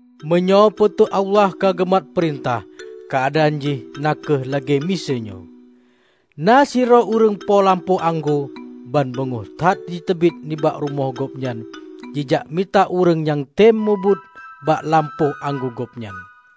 "Meunyoe Po teu Allah ka geumat peurintah, keuadaan jih na kheueh lagée miseue nyoe: Na sidroe ureuëng po lampôh anggô ban beungoh that jiteubiet nibak rumoh gobnyan jijak mita ureuëng nyang tem meubuet bak lampôh anggô gobnyan.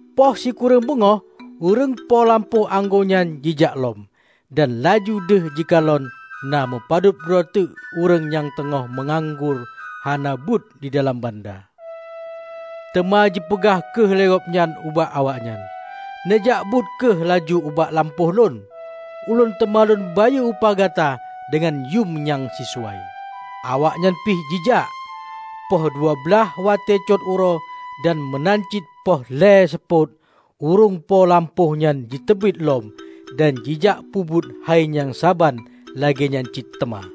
Poh sikureueng beungoh, ureuëng po lampôh anggô nyan jijak lom, dan laju deuh jikalon na meupadub droe teuk ureuëng nyang teungoh meunganggur hana buet di dalam banda. Teuma jipeugah kheueh lé gobnyan ubak awaknyan, 'Neujak buet kheueh laju ubak lampôh lôn. Ulôn teuma lôn bayeue upah gata deungon yuem nyang sisuai.' Awaknyan pih jijak. Poh dua blaih watée cot uroe dan meunan cit poh lhée seupôt, ureuëng po lampôhnyan jiteubiet lom dan jijak peubuet hai nyang saban lagéenyan cit teuma.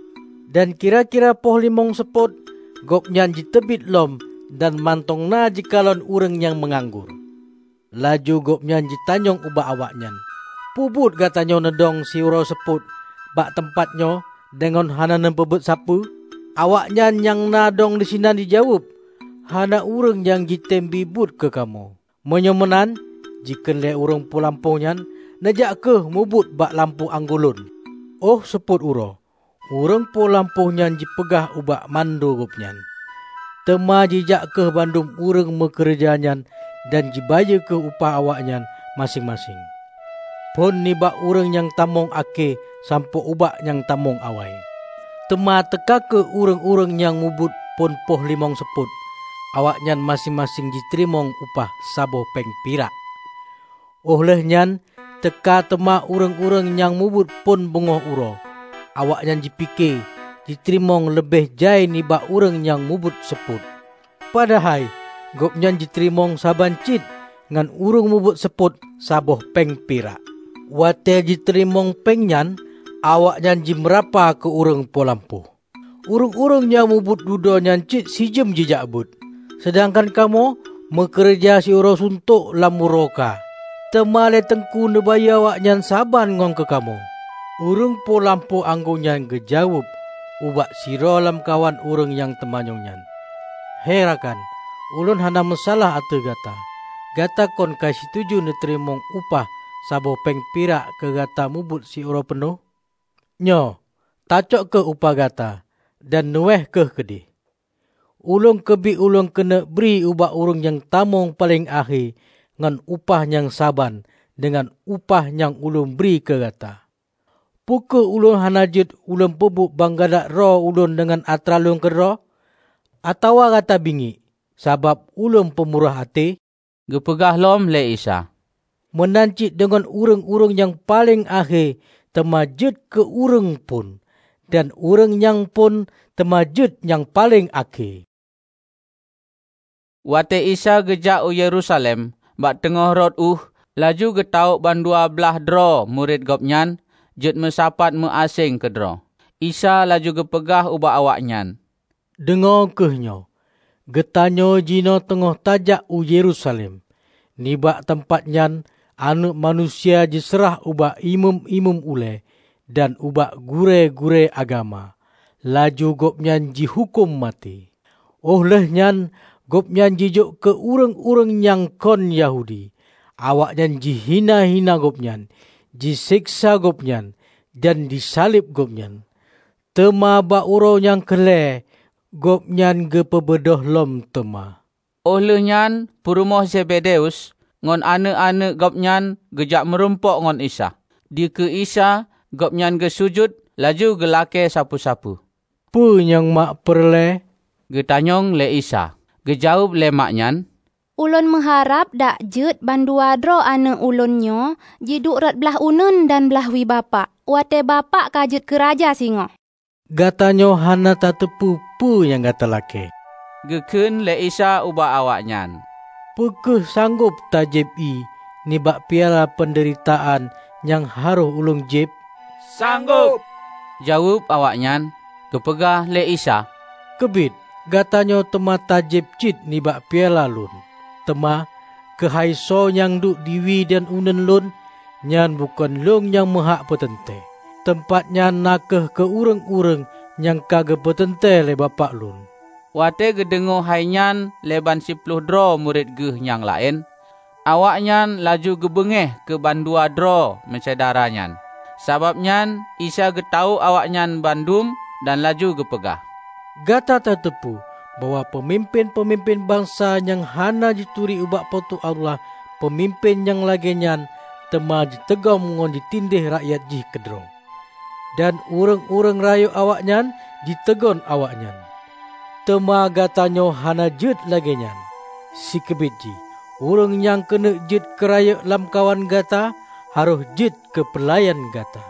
Dan kira-kira poh limong seupôt, gobnyan jiteubiet lom dan mantong na jikalon ureuëng nyang meunganggur. Laju gobnyan jitanyong ubak awaknyan, 'Peubuet gatanyoe neudong siuroe seupôt bak teumpat nyoe deungon hana neupeubuet sapeue?' Awaknyan nyang na dong disinan jijaweueb, 'Hana ureuëng nyang jitem bie buet keu kamoe.' 'Meunyoe meunan,' jikheun lé ureuëng po lampôh nyan, 'neujak kheueh mubuet bak lampôh anggô lôn.' Óh seupôt uroe, ureuëng po lampôh nyan jipeugah ubak mando gobnyan, 'Teuma jijak kheueh bandum ureuëng meukeureuja nyan dan jibayeue kheueh upah awaknyan maséng-maséng, phon nibak ureuëng nyang tamong akhé sampoe ubak nyang tamong awai.' Teuma teuka kheueh ureuëng-ureuëng nyang mubuet phon poh limong seupôt. Awaknyan maséng-maséng jiteurimong upah saboh péng pirak. Óh lheueh nyan teuka teuma ureuëng-ureuëng nyang mubuet phon beungoh uroe. Awaknyan jipike jiteurimong leubeh jai nibak ureuëng nyang mubuet seupôt, padahai gobnyan jiteurimong saban cit ngon ureuëng mubuet seupôt saboh péng pirak. Watée jiteurimong péng nyan, awaknyan jimeurapa keu ureuëng po lampôh: 'Ureuëng-ureuëng nyang mubuet dudoe nyan cit sijeuem jijak buet. Seudangkan kamoe meukeureuja siuroe suntok lam uroe kha, teuma lé Teungku neubayeue awaknyan saban ngon keu kamoe!' Ureuëng po lampôh anggô nyan geujaweueb ubak sidroe lamkawan ureuëng nyang teumanyong nyan, 'He rakan, ulôn hana meusalah ateueh gata. Gata kon ka situju neuteurimong upah saboh péng pirak keu gata mubuet siuroe peunoh? Nyoe, tacok kheueh upah gata dan neuweh kheueh keudeh. Ulôn keubiet lôn keuneuk bri bak ureuëng nyang tamong paleng akhé ngon upah nyang saban deungon upah nyang ulôn bri keu gata. Peu kheueh ulôn hana jeuet lôn peubuet ban galak droe ulôn deungon atra lôn keudroe? Atawa gata bingiek, sabab ulôn peumurah até?' " Geupeugah lom lé Isa, "Meunan cit deungon ureuëng-ureuëng nyang paleng akhé teuma jeuet keu ureuëng phon, dan ureuëng nyang phon teuma jeuet nyang paleng akhé." Watée Isa geujak u Yerusalem, bak teungoh rot ueh laju geutawök bandua blaih droe murit Gobnyan jeuet meusapat meu aséng keudroe. Isa laju geupeugah ubak awaknyan, "Deungoe kheueh nyoe! Geutanyoe jinoe teungoh tajak u Yerusalem. Nibak teumpat nyan Aneuëk Manusia jiseurah ubak imeum-imeum ulée dan ubak gurée-gurée agama. Laju Gobnyan jihuköm maté, óh lheueh nyan Gobnyan jijok keu ureuëng-ureuëng nyang kon Yahudi. Awaknyan jihina-hina Gobnyan, jiseksa Gobnyan, dan jisaleb Gobnyan. Teuma bak uroe nyang keu lhée, Gobnyan geupeubeudôh lom teuma." Óh lheueh nyan purumoh Zebedeus ngon aneuëk-aneuëk gobnyan geujak murumpok ngon Isa. Dikeue Isa gobnyan geusujut laju geulakée sapeue-sapeue. "Peue nyang mak peureulée?" geutanyong lé Isa. Geujaweueb lé mak nyan, "Ulôn meuharab dak jeuet ban dua droe aneuëk ulôn nyoe jiduek rot blaih uneuen dan blaih wie Bapak watée Bapak ka jeuet keu Raja singoh." "Gata nyoe hana tateupeue peue nyang gata lakée," Geukheun lé Isa ubak awaknyan. "Peu kheueh sanggob tajieb ié nibak piala peundeuritaan nyang harôh Ulôn jieb?" "Sanggob," jaweueb awaknyan. Geupeugah lé Isa, "Keubiet, gatanyoe teuma tajieb cit nibak piala Lôn. Teuma keuhai soe nyang duek di wie dan uneuen Lôn, nyan bukon Ulôn nyang meuhak peuteuntée. Teumpat nyan na kheueh keu ureuëng-ureuëng nyang ka geupeuteuntée lé Bapak Lôn." Watée geudeungoe hai nyan lé ban siploh droe murit Geuh nyang laén, awaknyan laju geubeungéh keu bandua droe meusyedara nyan. Sabab nyan Isa geutawök awaknyan bandum dan laju geupeugah, "Gata tateupeue bahwa peumimpén-peumimpén bansa nyang hana jituri ubak Po teu Allah peumimpén nyang lagée nyan teuma jiteugom ngon jitindéeh rakyat jih keudroe. Dan ureuëng-ureuëng rayeuk awaknyan jiteugon awaknyan. Teuma gata nyoe hana jeuet lagée nyan. Sikeubiet jih, ureuëng nyang keuneuk jeuet keu rayeuk lam kawan gata, harôh jeuet keu peulayan gata.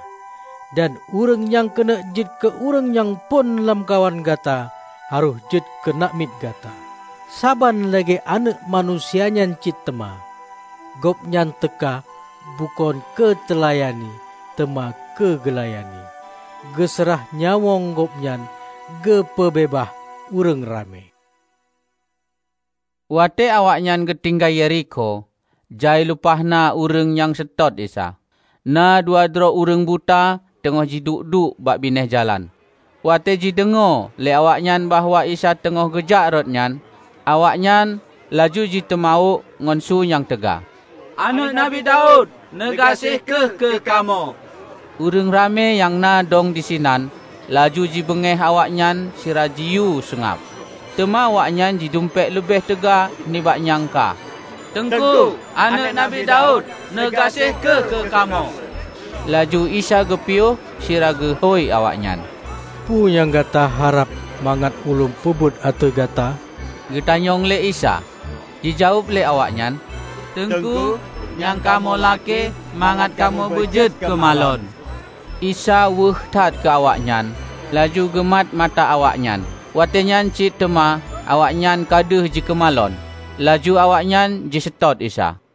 Dan ureuëng nyang keuneuk jeuet keu ureuëng nyang phon lamkawan gata, harôh jeuet keu namiet gata. Saban lagée Aneuëk Manusia nyan cit teuma; Gobnyan teuka bukon keu teulayani teuma keu geulayani, geuseurah nyawöng Gobnyan keu geupeubeubaih ureuëng ramé." Watée awaknyan geutinggai Yerikho, jai lumpah na ureuëng nyang seutôt Isa. Na dua droe ureuëng buta teungoh jiduek-duek bak binéh jalan. Watée jideungoe lé awaknyan bahwa Isa teungoh geujak rot nyan, awaknyan laju jiteumawök ngon su nyang teuga, "Aneuëk Nabi Daud, neugaséh kheueh keu kamoe!" Ureuëng ramé nyang na dong disinan laju jibeungéh awaknyan sira jiyue seungab. Teuma awaknyan jidumpék leubeh teuga nibak nyang ka, "Teungku, Aneuëk Nabi Daud, neugaséh kheueh keu kamoe!" Laju Isa geupiôh sira geuhôi awaknyan, "Peue nyang gata harab mangat Ulôn peubuet ateueh gata?" geutanyong lé Isa. Jijaweueb lé awaknyan, "Teungku, nyang kamoe lakée mangat kamoe beujeuet keumalon!" Isa weueh that keu awaknyan, laju geumat mata awaknyan. Watée nyan cit teuma awaknyan ka deuh jikeumalon. Laju awaknyan jiseutôt Isa.